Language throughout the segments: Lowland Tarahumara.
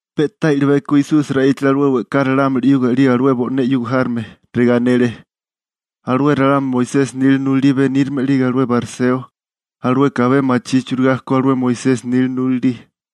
Pe'tá i'libeko Esusi ra'íchale alué we'ká ralámuli 'yuga 'lige alué bo'né 'yuga járome, regá anele: ―Alué ralámuli Moisesi nila nulalí benírame 'lige alué bariseo, alueka abé machí churigá ko alué Moisesi nila nulalí.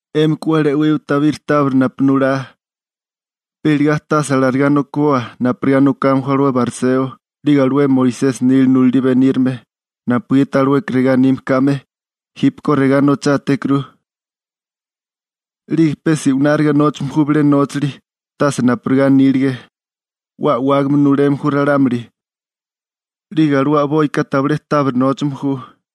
'Émika 'we 'la e'wiwa tabiri tábiri napu nulá, pe iligá tase alarigá nokiboa, napurigá nokame ju alué bariseo, 'lige alué Moisesi nila nulalí benírame, napugiti alueka regá anime kame: «Jípeko regá nochátékuru.» 'Lige pe se'wináriga nóchame ju bilé nóchali, tase napurigá anílige. 'We a'wágame nuleme ju ralámuli, 'lige alué a'boika tabilé tábiri nóchame ju.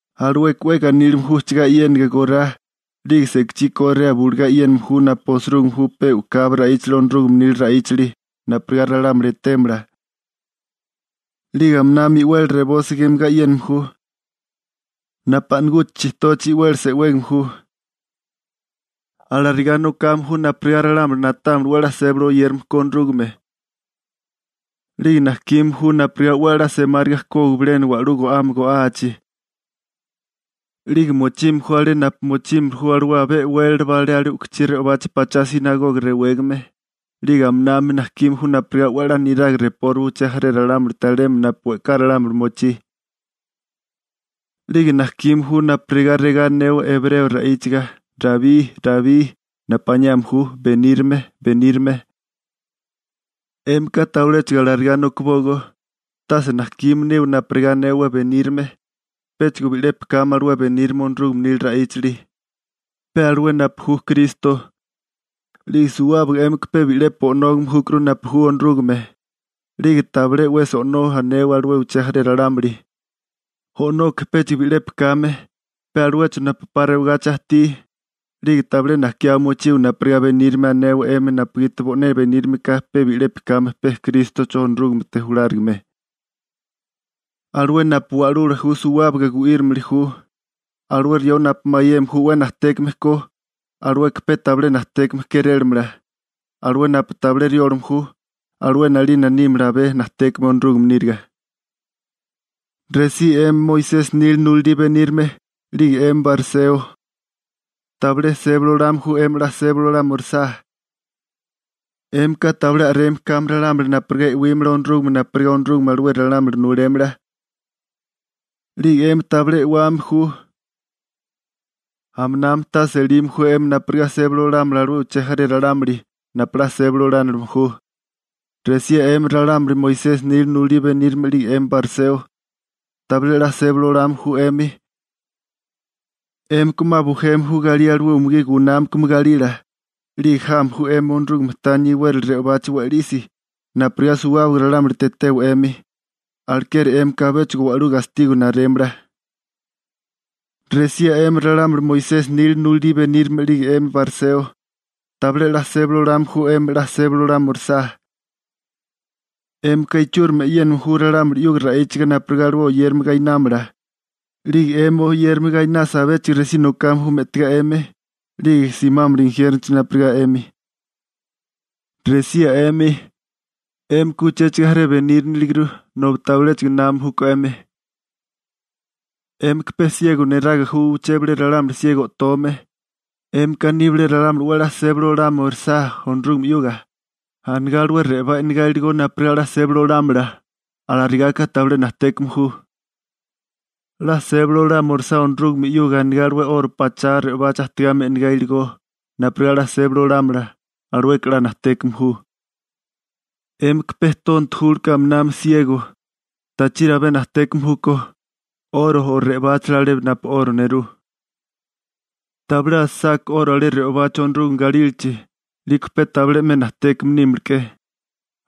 Alueka 'we ganílime ju ujchagá e'yénaga gorá, 'lige sekachí korea bulugá e'yéname ju napu osirúgime ju pe u'kabi ra'íchali Onorúgame nila ra'íchali, napurigá ralámuli etémala. 'Lige aminami i'weli reboso gemagá e'yéname ju, napu a'naguchi chitochi i'weli se'wégame ju. Alarigá nokame ju napurigá ralámuli na'támala 'we a'lá sébali oyérame ko Onorúgame. 'Lige najkime ju napurigá 'we a'lá semáriga kógiwa bilena wa'lú go'ame go'achi. 'Lige mochime ju alé napu mochímili ju alué abé e'wélala alé u'kuchí re'obachi pachá «sinagoga» rewégame, 'lige aminami najkime ju napurigá 'we 'la niraga repóriwa uché jaré ralámulite alemi napu we'ká ralámuli mochí. 'Lige najkime ju napurigá regá anewa ebreo ra'íchaga: «Rabbí» (napu aniame kéré benírame). › 'Émika tabiléchigo alarigá nokibógó, tase najkime niwa napurigá anewa «benírame», péchigo bi'lepi kame alué benírame Onorúgame nila ra'íchali, pe alué napu ju Kristo, 'lige suwábaga 'émika bi'lepi O'nógame júkuru napu ju Onorúgame. 'Lige tabilé 'wesi «o'nó» anewa alué uché jaré ralámuli, O'noka péchigo bi'lepi kame, pe aluecho napu 'pa rewagachi ajtí. 'Lige tabilé najkiá mochiwa napurigá «benírame» anewa 'emi napugiti bo'né benírame ka pe bi'lepi kame pe Krístocho Onorúgamete julárigame. Alué napu wa'lula ju suwábaga gu'írimili ju. Alué rió napu mayeme ju 'we najtékame ko, alueka pe tabilé najtékame kérélamala. Alué napu tabilé riólame ju, alué 'nalina nímala abé najtékame Onorúgame níriga. › ¡Resí 'emi Moisesi nila nulalí benírame 'lige 'emi bariseo, tabilé sébali olame ju 'emi 'la sébali olámirisá! 'Émika tabilé a'reme kame ralámuli napurigá e'wímala Onorúgame napurigá Onorúgame alué ralámuli nulémala. 'Lige 'emi tabilé e'wame ju. Aminami tase elime ju 'emi napurigá sébali olámala alué uché jaré ralámuli napu 'la sébali olánilime ju. › ¡Resía 'emi ralámuli Moisesi nila nulalí benírame 'lige 'emi bariseo, tabilé 'la sébali olame ju 'emi! 'Émika 'ma bujeme ju galí alué umugí gunámakame galila, 'lige jame ju 'emi Onorúgame tania iwérali re'obachi we'lisi napurigá suwábaga ralámulite etewa 'emi. Alekeri 'émika abéchigo wa'lú gastigo narémala. › ¡Resía 'emi ralámuli Moisesi nila nulalí benírame 'lige 'emi bariseo, tabilé 'la sébali olame ju 'emi 'la sébali olámirisá! 'Émika ichúrimi e'yéname ju ralámuli 'yuga ra'íchiga napurigá alué oyérame gainámala, 'lige 'emi oyérame gainasa abéchigo resí nokame ju me'tigá 'emi, 'lige simámala injiérnochi napurigá 'emi. › ¡Resía 'emi, 'émika uchéchigo jaré beníriniliguru nobi tabiléchigo námame júkó 'emi! ¡'Émika pe siego neraga ju uché bilé ralámuli siego o'tome! 'Émika aní bilé ralámuli 'we a'lá sébali olama orisá Onorúgame 'yuga, anigá alué re'obá e'negá iligó napurigá 'la sébali olámala, alarigaka tabilé najtékame ju. 'La sébali olama orisá Onorúgame 'yuga anigá alué 'oro pachá re'obachi ajtígame e'negá iligó, napurigá 'la sébali olámala, alueka 'la najtékame ju. ¡'Émika pe tonto julke 'lige aminami siego! ¿Tachiri abé najtékame júkó, 'oro o re'obáchala alé napu 'oro nerú? Tabilé nerúlasaká 'oro alé re'obachi Onorúgame galílachi, 'liko pe tabilé 'me najtékame nímiliké.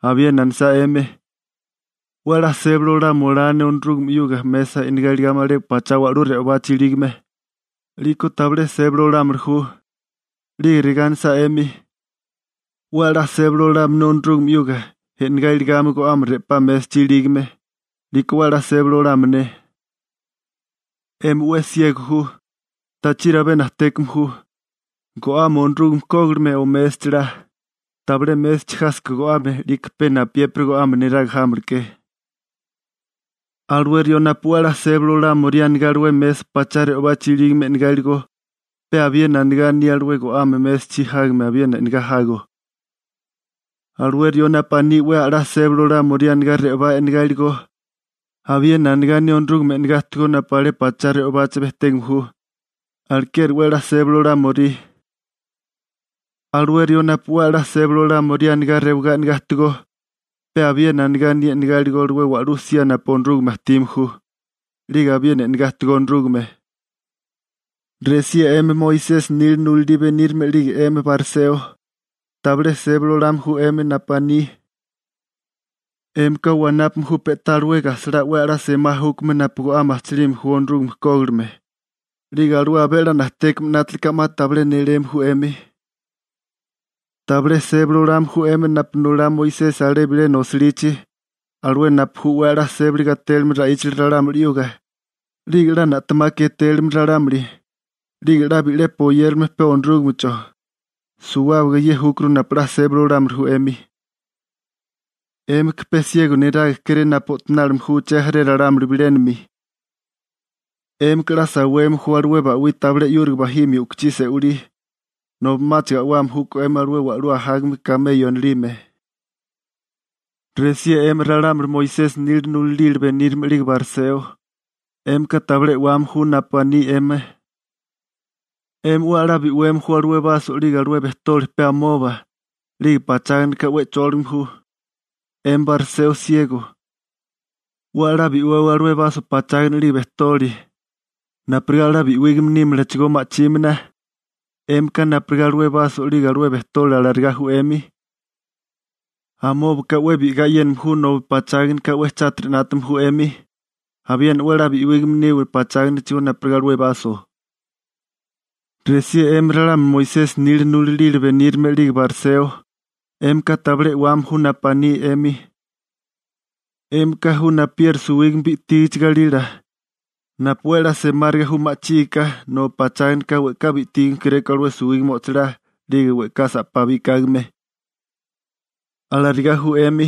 Abiena anisá 'emi: «'We a'lá sébali olama olá ne Onorúgame 'yuga mesa e'negá iligame alé pachá wa'lú re'obachi ilígame», 'liko tabilé sébali olámili ju. 'Lige regá anisá 'emi: «'We a'lá sébali olame ne Onorúgame 'yuga, e'negá iligame go'ame re'pá mésachi ilígame», 'liko 'we a'lá sébali olame ne. ¡'Emi 'we siego ju! ¿Tachiri abé najtékame ju, go'ame Onorúgame kógilime o mésachala? Tabilé mésachi jásaká go'ame, 'liko pe napuyépiri go'ame neraga jámilike. Alué rió napu 'we a'lá sébali olámorí anigá alué mesa pachá re'obachi ilígame e'negá iligó, pe abiena anigá aní alué go'ame mésachi jágame abiena e'negá jago. Alué rió napu aní 'we a'lá sébali olámorí anigá re'obá e'nagá iligó, abiena anigá aní Onorúgame e'negá ajtigó napu alé pachá re'obachi bejtégame ju, alekeri 'we a'lá sébali olámorí. Alué rió napu 'we a'lá sébali olámorí anigá rewagá e'negá ajtigó, pe abiena anigá aní e'negá iligó alué wa'lú sía napu Onorúgame ajtime ju, 'lige abiena e'negá ajtigó Onorúgame. › ¡Resía 'emi Moisesi nila nulalí benírame 'lige 'emi bariseo, tabilé sébali olame ju 'emi napu aní! 'Émika wanápame ju pe'tá alué gajsalá 'we a'lá semá júkame napu go'ame ajchilime ju (yerbabuena, anís, komino) Onorúgame kógilime, 'lige alué abé a'lá najtékame 'nátilika 'ma tabilé néléme ju 'emi. Tabilé sébali olame ju 'emi napu nulá Moisesi alé bilena osilichi, alué napu ju 'we a'lá sébali gatélime ra'íchali ralámuli 'yuga, 'lige 'la na'temaka etélime ralámuli, 'lige 'la bi'lepi oyérilime pe Onorúgamecho. Suwábaga ye júkuru napu 'la sébali olámili ju 'emi. ¡'Émika pe siego neraga kéré napu o'tonálime ju uché jaré ralámuli bilénami! ¡'Émika a'lá saweme ju alué ba'wí tabilé 'yúriga bajimia u'kuchí se'walí, nobi 'máchigo a'wame júkó 'emi alué wa'lú ajágame kameyo anilime! › ¡Resía 'emi ralámuli Moisesi nila nulalila benírame 'lige bariseo, 'émika tabilé e'wame ju napu aní 'emi! 'Emi 'we a'lá bi'weme ju alué baso 'lige alué bejtoli pe amoba, 'lige pacháganaka 'we chóligame ju. 'Emi bariseo siego: 'we a'lá bi'wewa alué baso pachágana 'lige bejtoli, napurigá 'la bi'wígame nímalachigó ma'chímana. 'Émika napurigá alué baso 'lige alué bejtoli alarigá ju 'emi. Amóbaka 'we bi'igá e'yéname ju nobi pacháganaka 'we chátiri 'nátame ju 'emi. Abiena 'we a'lá bi'wígame niwa pacháganachigó napurigá alué baso. › ¡Resía 'emi ralámuli Moisesi nila nulalí benírame 'lige bariseo, 'émika tabilé e'wame ju napu aní 'emi! 'Émika ju napuyeri suwígame bi'tígichi galila, napu 'we a'lá semáriga ju ma'chígiká, nobi pacháganaka we'ká bi'tígame kéréko alué suwígame o'chilá 'lige we'ká sa'pá bikágame. Alarigá ju 'emi,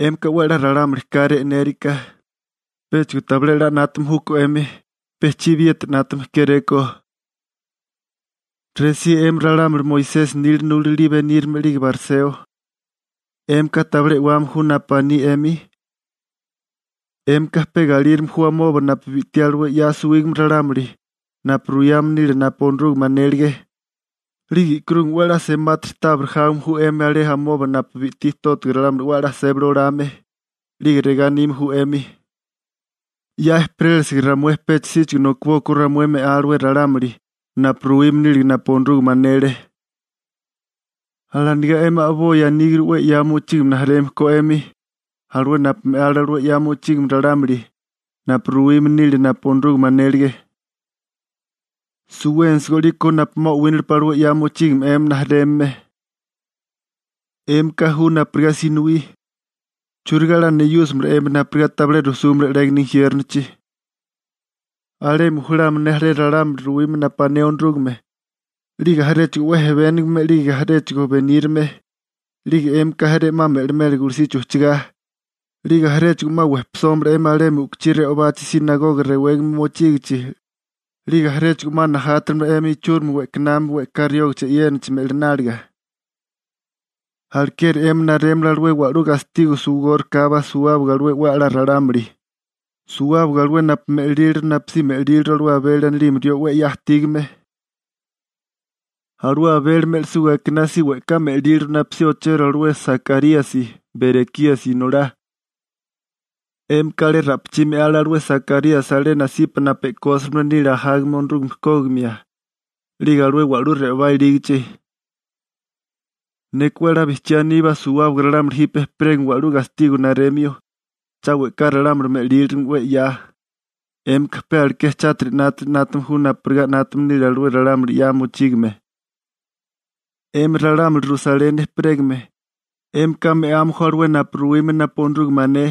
'émika 'we a'lá ralámuli káré e'nériká péchigo tabilé 'la 'nátame júkó 'emi, pe chibiyeti 'nátame kéréko. › ¡Resía 'emi ralámuli Moisesi nila nulalí benírame 'lige bariseo, 'émika tabilé e'wame ju napu aní 'emi! 'Émika pe galírime ju amoba napu bi'tí alué 'ya suwígame ralámuli napu ruyame nile napu Onorúgame anélige, 'lige e'karúgame 'we a'lá semátiri tábiri jáwame ju 'emi alé amoba napu bi'tí tótiga ralámuli 'we a'lá sébali olame, 'lige regá anime ju 'emi: «'Ya ejperélisiga ramué pecha síchigo nokibókó ramué me'á alué ralámuli, napu ruwime nílige napu Onorúgame anele.» Alanigá 'emi a'boi aníguru alué 'ya mochígame rijimala ko 'emi alué napu me'ale alué 'ya mochígame ralámuli, napu ruwime nile napu Onorúgame anélige. ¡Suwénisigó 'liko napu 'ma o'wínalepa alué 'ya mochígame 'emi rijimala! › ¡'Émika ju napurigá sinowí! ¿Churigá 'la neyúsimala 'emi napurigá tabilé rujsúmala 'légana injiérnochi? Alemi julámala ne jaré ralámuli ruwime napu ané Onorúgame, 'lige jaréchigo 'we ejebénigame 'lige jaréchigo benírame, 'lige 'émika jaré 'ma me'limela gulusichi ujchagá, 'lige jaréchigo 'ma wejpisómala 'emi alemi u'kuchí re'obachi «sinagoga» rewégame mochígichi, 'lige jaréchigo 'ma najátamala 'emi ichúrimi we'kanami we'ká riógichi e'yénachi me'lináliga. Alekeri 'emi narémala alué wa'lú gastigo suwigórikábá suwábaga alué 'we a'lá ralámuli, suwábaga alué napu me'líliru napusí me'líliru alué Abeli anilime rió 'we 'ya ajtígame. Alué Abeli me'lisuga akiná si we'ká me'líliru napusí ochero alué Sakaríasi, Berekíasi inolá. 'Émika alé ra'pichí me'ale alué Sakaríasi alé nasipa napu e'kósime nile ajágame Onorúgame kógimia, 'lige alué wa'lú re'obá ilígichi. Neka 'we a'lá bijchiá aníbá suwábaga ralámuli jipe ejperégame wa'lú gastigo naremio, cha we'ká ralámuli me'lílirigime 'we 'ya. 'Émika pe aleké chátiri 'nátili 'nátame ju napurigá 'nátame nile alué ralámuli 'ya mochígame. › ¡'Emi ralámuli Rusaleni ejperégame, 'émika me'ame ju alué napu ruwime napu Onorúgame ané,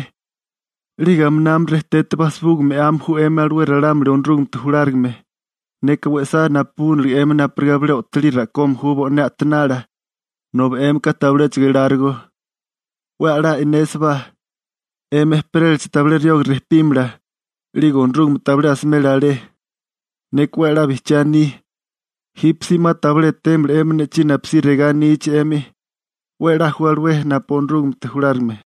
'lige aminami rejtete bajsibuga me'ame ju 'emi alué ralámuli Onorúgamete julárigame! ¡Neka we'sá 'we napabúnilige 'emi napurigá bilé o'tolí ra'kome ju bo'né a'tanala, nobi 'émika tabiléchigo elárigó! 'We a'lá e'nésibá, 'emi ejperélachi tabilé rioga rejpímala, 'lige Onorúgame tabilé asimela alé. Neka 'we a'lá bijchiá aní, jípesí 'ma tabilé etémala 'emi ne'chí napusí regá anichi 'emi: «¡'We a'lá ju alué napu ju Onorúgamete julárigame!»